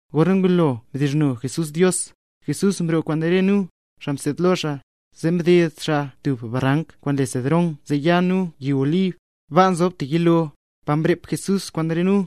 Gorna ngulo mdizhno Jesús Dios, Jesús mroo kwaan re nu, xaa mseed lo xaa, zee mded xaa tub barank kwaan le Cedrón zee ya nu yi Olib. Baa nzob tub yilo, pa mrep Jesús kwaan re nu.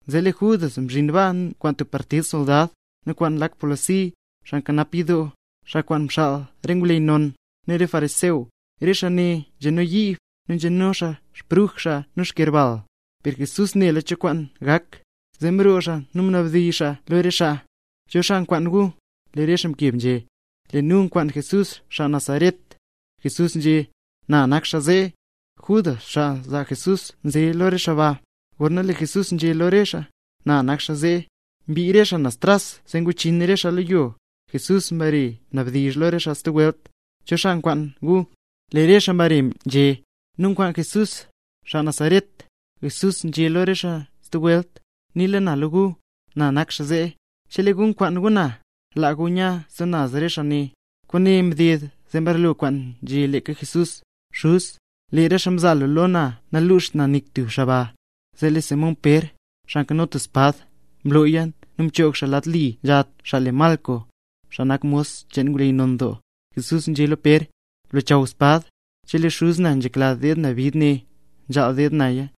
Zee lee Judas mzhin baa kwaan tub partid soldad, nu kwaan lak polisi, xaa nkanap yidoo, xaa kwaan mxaal re ngwleyy non, nu re fariseo. Re xaa ne nzeno yiib, nu nzeno xaa xbruj xaa nu yerbal. Per Jesús nela cho kwaan gak, zee mroo xaa nu mnabdizh xaa lo re xaa: —¿Cho xaa nkwaan gu? Lee re xaa mkeb nzhé: —Lee nu nkwaan Jesús xaa Nazaret. Jesús nzhé: —Na nak xaa zee. Judas, xaa zaa Jesús nze lo re xaa ba. Gorna lee Jesús nzhé lo re xaa: “Na nak xaa zee”, mbii re xaa naz tras zee nguchin re xaa lo yo. Jesús mbare mnabdizh lo re xaa stub welt: —¿Cho xaa nkwaan gu? Lee re xaa mbare nzhé: —Nu nkwaan Jesús, xaa Nazaret. Jesús nzhé lo re xaa stub welt: —Niila na lo gu, na nak xaa zee. Chelee gu nkwaan gu na, laa gu nya re stub naz xaa ne. Kwaane mded zee mbarlo kwaan nzhé leeka Jesús: “Xuz, lee re xaa mzaa lu lo na namluxt nik tub xaa ba”. Zee lee Simón Pér, xaa nkano tub espad, mlooya nu mchoog xaa lad li nzha tub xaa le Malco, xaa nak mos cheen ngwleyy non doo. Jesús nzhé lo Pér: —Blochaw espad. Chelee Xuz na nzhekla deed na bid ne, nzhaal deed naya.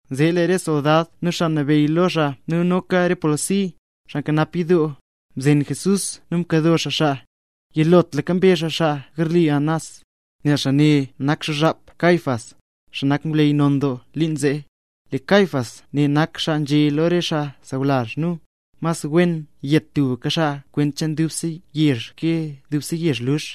Zee lee re soldad nu xaa nabeyy lo xaa nu noka re polisi, xaa nkanap yidoo, mzen Jesús nu mkado xaa xaa. Yilotlaka mbe xaa xaa garli Anás, nel xaa ne nak xuzhap Caifás, xaa nak ngwleyy non doo liin zee. Leeka Caifás ne nak xaa nzhé lo re xaa sawlazh nu, mas wen yet tubka xaa kwent cheen dubse yezh ke dubse yezh lux.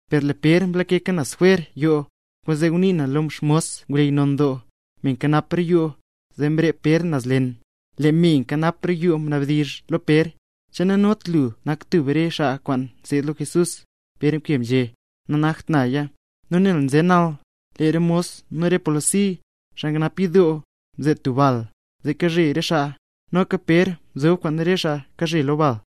per lee Pér mlake naz jwer roo yoo. Kwaanzee ngunii na lo xmos ngwleyy non doo, me nkanap roo yoo, zee mrep Pér naz leen. Lee me nkanap roo yoo mnabdizh lo Pér, nzhé: —¿Che nanot lu nak tub re xaa kwaan kaseed lo Jesús? Pér mkeb nzhé: —Nanakt naya. Nu nel nze nal, lee re mos nu re polisi, xaa nkanap yidoo, mzee tub bal, nu kazhe re xaa. Noka Pér nzob kwaan re xaa kazhe lo bal.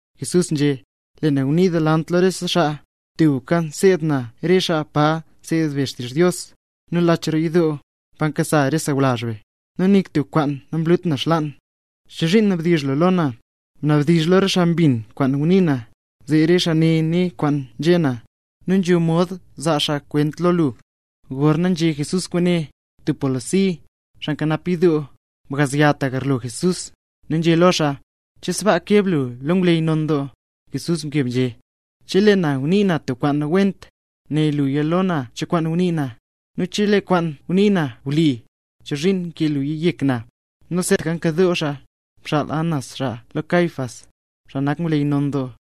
Jesús nzhé: —Lee na ngunii delant lo rese xaa; tubka nseed na re xaa pa nseed be xtizh Dios, nu lach roo yidoo, pa nkasa re sawlazh be; nu nik tub kwaan namlut na xlaan. ¿Chozhiin nabdizh lu lo na? Bnabdizh lo re xaa mbin kwaan ngunii na, zee re xaa né re kwaan nzhé na, nu nzho mod zaa xaa kwenta lo lu. Gorna nzhé Jesús kwaane, tub polisi, xaa nkanap yidoo, mgazya ta garlo Jesús, nu nzhé lo xaa: —¿Che sbaa mkeb lu lo ngwleyy non doo? Jesús mkeb nzhé: —Chelee na ngunii na tub kwaan nawent, né lo na cho kwaan ngunii na; nu chelee kwaan ngunii na wli, ¿chozhiin mkee lu yek na? Nu seetaka nkadoo xaa, mxaal Anás xaa lo Caifás, xaa nak ngwleyy non doo.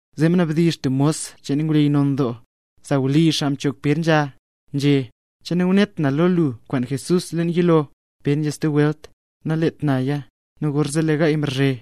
Zee mnabdizh tub mos cheen ngwleyy non doo, sawlizh xaa mchoog Pér nzha, nzhé: —¿Che nangunet na lo lu kwaan Jesús, leen yilo? Pér nzhé stub welt: —Nalet naya. Nu gorzee lee gaay mrazhe.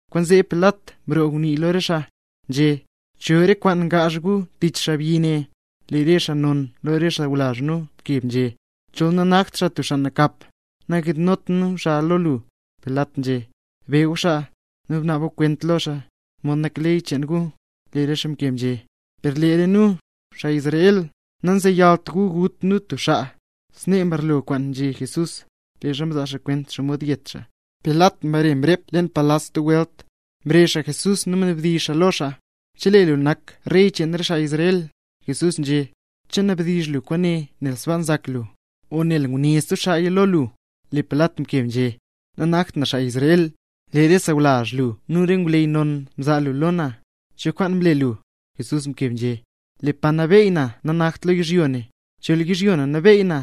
Kwaanzee Pilat mroo ngunii lo re xaa, nzhé: —¿Cho re kwaan ngaazh gu tich xaabyi ne? Lee re xaa non lo re xaa sawlazh nu mkeb, nzhé: —Chol nanakt xaa tub xaa nakap, nangiidnot nu xaa lo lu. Pilat nzhé: —Be gu xaa, nu bnaab gu kwent lo xaa, mod nak ley cheen gu. Lee re xaa mkeb nzhé: —Per lee re nu, xaa Israel, nanzeyalt gu gut nu tub xaa. Snee mbarlo kwaan nzhé Jesús, leezha mzaa xaa kwent xomod yet xaa. Pilat mbare mrep leen palas stub welt, mrezh xaa Jesús, nu mnabdizh xaa lo xaa: —¿Che lu nak Rey cheen re xaa Israel? Jesús nzhé: —¿Che nabdizh lu kwaane nel sbaa nzak lu, o nel nguné stub xaaya lo lu? Lee Pilat mkeb nzhé: —Nanakt na xaa Israel, lee re xaa sawlazh lu nu re ngwleyy non mzaa lu lo na. ¿Cho kwaan mle lu? Jesús mkeb nzhé: —Lee Pa Nabeey na nanakt lo yizhyo ne. Chol yizhyo ne nabeey na,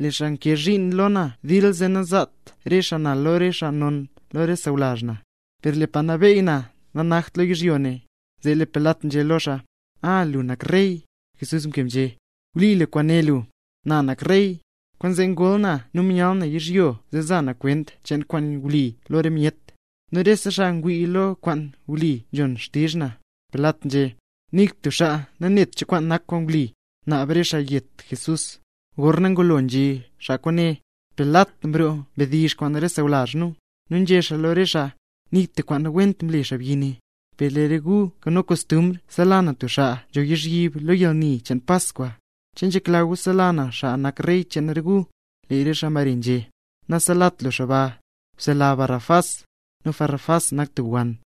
lee xaa kwaan nkee zhiin lo na dil, zee nangzaat re xaa na lo re xaa non lo re sawlazh na. Per lee Pa Nabeey na nanakt lo yizhyo ne. Zee lee Pilat nzhé lo xaa: —A, lu nak rey. Jesús mkeb nzhé: —Wli kwaan né lu, na nak rey. Kwaanzee ngol na nu myal na yizhyo zee za na kwent cheen kwaan wli lo re myet. Nu rese xaa ngwii lo kwaan wli nzhon xtizh na. Pilat nzhé: —Nik tub xaa nanet cho kwaan nak kwaan wli. Naab re xaa yet Jesús Gorna ngulo nzhé xaa kwaane, Pilat mroo mdizh kwaan re xaa sawlazh nu, nu nzhé xaa lo re xaa: —Nik tub kwaan nawent mle xaabyi ne. Per lee re gu nkano kostumbr nsela na tub xaa nzho lozhyib lo yalni cheen Paskwa. ¿Che nzhekla gu sela na xaa nak Rey cheen re gu? Re xaa mbare nzhé: —¡Naselat lu xaa ba! ¡Bsela Barrabás! Nu Barrabás nak tub wann.